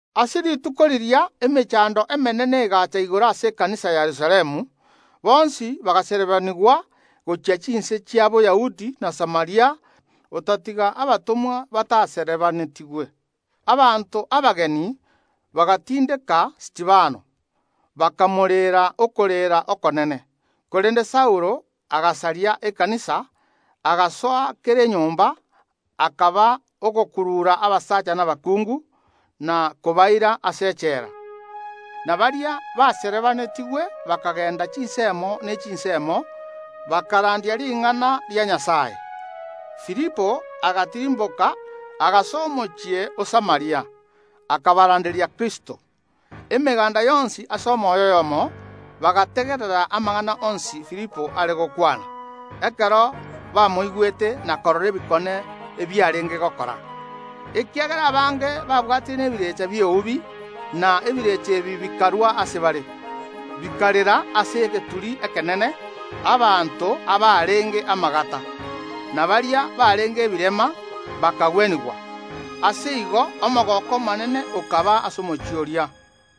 Ase rituko riria emechando emenene egaacha igoro ase ekanisa ya Yerusalemu; bonsi bagaserebanigwa gochia chinse chia Boyahudi na Samaria, otatiga abatomwa bataserebaanetigwe. Abanto abeegeni bagatindeka Stefano, bakamoreera okorera okonene. Korende Saulo agasaria ekanisa, agasoa kera enyomba akaba ogokurura abasacha na abakungu, na kobaira ase echela. Na baria baserebaanetigwe bakagenda chinsemo ne chinsemo, bakarandia ring’ana ria Nyasae. Filipo agatirimboka, agasoa omochie o Samaria, akabaranderia Kristo. Emeganda yonsi ase omoyo oyomo bagategerera amang’ana onsi Filipo are gokwana, ekero bamoigwete na korora ebikone ebiarenge gokora. Ekiagera abange babwatire nebirecha bi’eubi, na ebirecha ebi bikarwa ase bare, bikarera ase egeturi ekenene; abanto abarenge amagata, na baria barenge ebirema bakagwenigwa. Ase igo omogooko omonene okaba ase omochie oria.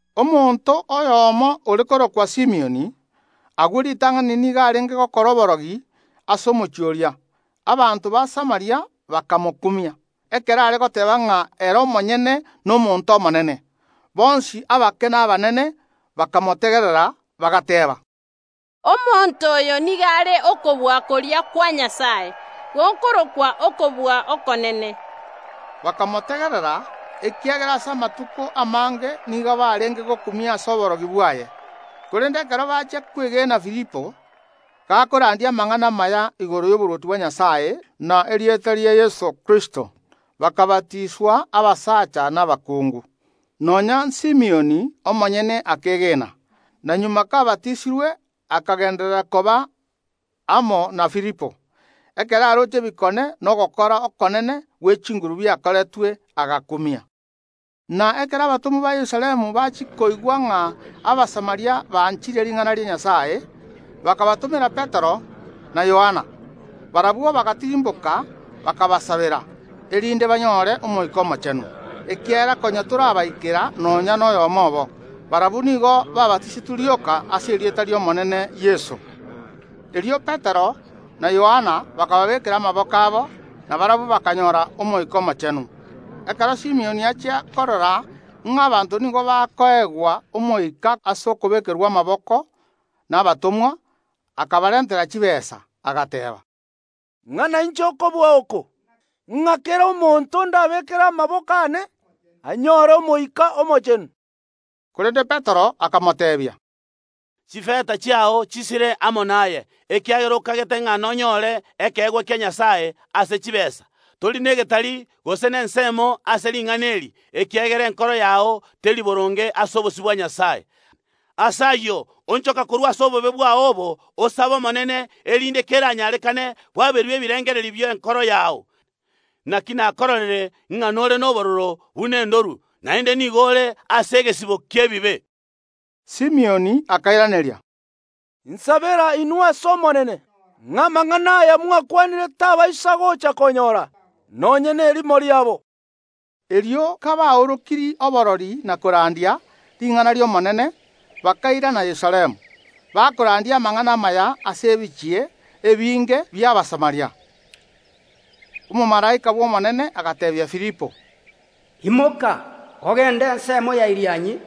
Omonto oyomo ore korokwa Simioni, agwo ritang’ani nigo arenge gokora oborogi ase omochie oria; abanto ba Samaria bakamokumia, ekero are goteeba ng’a ere omonyene nomonto omonene. Bonsi, abake na abanene, bakamotegerera, bagateeba: “Omonto oyo nigo are okobua koria kwa Nyasae gokorokwa Okobua Okonene.” Bakamotegerera, ekiagera ase amatuko amange nigo barenge gokumia ase oborogi bwaye. Korende ekero bachia kwegena Filipo, gakorandia amang’ana amaya igoro y’oborwoti bwa Nyasae na erieta ria Yeso Kristo, bakabatiswa, abasacha na abakungu. Nonya n’Simioni omonyene akeegena, na magega kabatisirwe akagenderera koba amo na Filipo. Ekero aroche ebikone na ogokora okonene gwe chinguru biakoretwe, agakumia. Na ekero abatomwa ba Yerusalemu bachia koigwa ng’a Abasamaria banchire ring’ana ria Nyasae, bakabatomera Petero na Yohana. Barabwo bagatirimboka, bakabasabera, erinde banyore Omoika Omochenu, ekiagera konya torabaikera nonya noyomo obo. Barabwo nigo baabatisetwe rioka ase erieta ri’Omonene Yeso. Erio Petero na Yohana bakababeekera amaboko abo, na barabwo bakanyora Omoika Omochenu. Ekero Simioni achia korora ng’a abanto nigo bakoegwa Omoika ase okobeekerwa amaboko nabatomwa, akabarentera chitaabu, agateeba: “Ing’a nainche okobua oko, ng’a kera omonto ndabeekere amaboko aane anyore Omoika Omochenu.” Korende Petero akamoteebia: “Chifeta chiao chisire amo naye, ekiagera okagete ng’a nonyore ekeegwa kia Nyasae ase chitaabu! Tori negetari gose nensemo ase ring’ana eri, ekiagera enkoro yao teri boronge ase obosio bwa Nyasae. Ase ayio onchoka korwa ase obobe bwao obo, osabe Omonene, erinde, keranyarekane, bwaberwe ebirengererio bi’enkoro yao. Naki nakororire ng’a nore nobororo buna endorwe, naende nigo ore ase egesibo ki’ebibe.” Simioni akairaneria: “Insabera inwe ase Omonene, ng’a amang’ana aya mwakwanire tabaisa gocha konyora nonya nerimo riabo.” Erio kabaorokirie oborori na korandia ring’ana ri’Omonene, bakairana Yerusalemu, bakorandia amang’ana amaya ase ebichie ebinge bi’Abasamaria. Omomalaika Omonene agateebia Filipo: “Imoka ogende ensemo ya Irianyi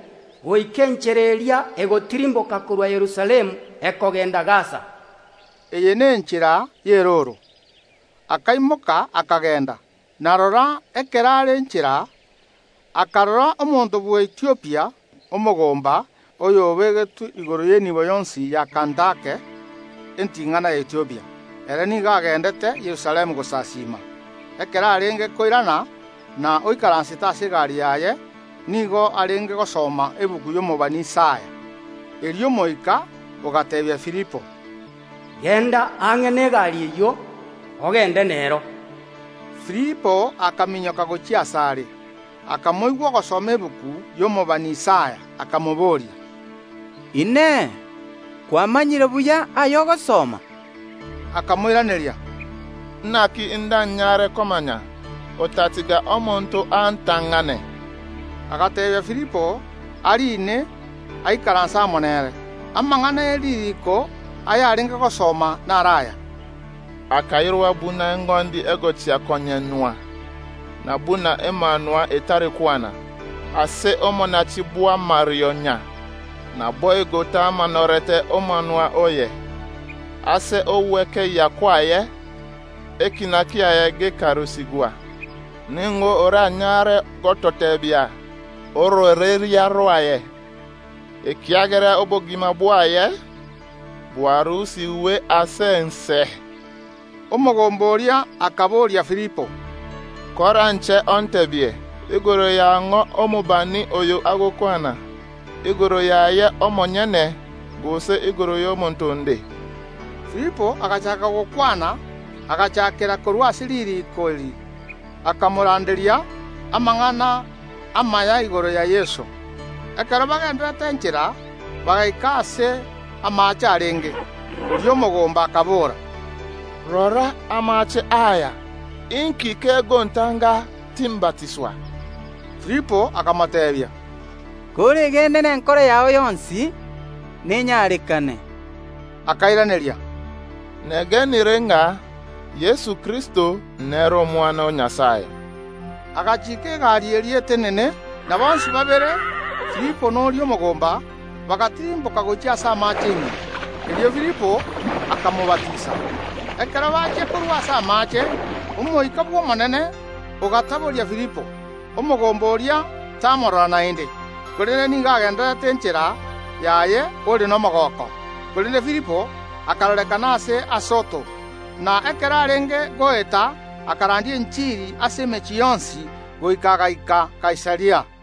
goika enchera eria egotirimboka korwa Yerusalemu ekogenda Gasa.” Eye nenchera y’erooro. Akaimoka, akagenda. Na rora, ekero are inchera, akarora omonto bw’Ethiopia, omokoreri, oyobegetwe igoro y’enibo yonsi ya Kandake, enting’ana ya Ethiopia. Ere nigo agendete Yerusalemu gosasiima. Ekero arenge koirana na oikaransete ase egari yaye, nigo arenge gosoma egetabu y’omobani Isaya. Erio Omoika ogateebia Filipo: “Genda ang’e negari eyio, ogende nero.” Filipo akaminyoka gochia asare, akamoigwa ogosoma egetabu y’omobani Isaya, akamobooria: “Inee! Kwamanyire buya aya ogosoma?” Akamoiraneria: “Naki ndanyare komanya otatiga omonto antang’ane?” Agateebia Filipo ariine, aikaranse amo nere. Amang’ana e ririiko ayarenge gosoma naro aya: “Akairwa buna eng’ondi egochia konyenywa, na buna emanwa etari kwana ase omonachi bw’amarionya, naboigo tamaanorete omonwa oye. Ase ogwekeyia kwaye ekiina kiaye gekarusigwa. Ning’o oranyare gototeebia ororeria rwaye? Ekiagera obogima bwaye bwarusigwe ase ense.” Omogomba oria akaboria Filipo: “Koranche onteebie igoro ya ng’o omobani oyo agokwana, igoro yaye omonyene gose igoro y’omonto onde?” Filipo agachaaka gokwana; agachakera korwa ase ririiko eri, akamoranderia amang’ana amaya igoro ya Yeso. Ekero bagendererete inchera, bagaika aase amaache arenge. Oria omogomba akabora: “Rora amaache aya! Inki kegontanga timbatiswa?” [ Filipo akamoteebia: “Koregene nenkoro yao yonsi, nenyarekane.” Akairaneria: “Negenire ng’a Yeso Kristo nere Omwana o Nyasae.”] Agachiika egari eria etenene, na bonsi babere, Filipo na oria omogomba, bagatirimboka gochia ase amaache ime, erio Filipo akamobatisa. Ekero bachia korwa ase amaache, Omoika bw’Omonene ogataboria Filipo; omogomba oria tamorora naende, korende nigo agendete enchera yaye ore nomogooko. Korende Filipo akarorekana ase Asoto, na ekero arenge goeta, akarandia enchiri ase emechie yonsi, goika agaika Kaisaria.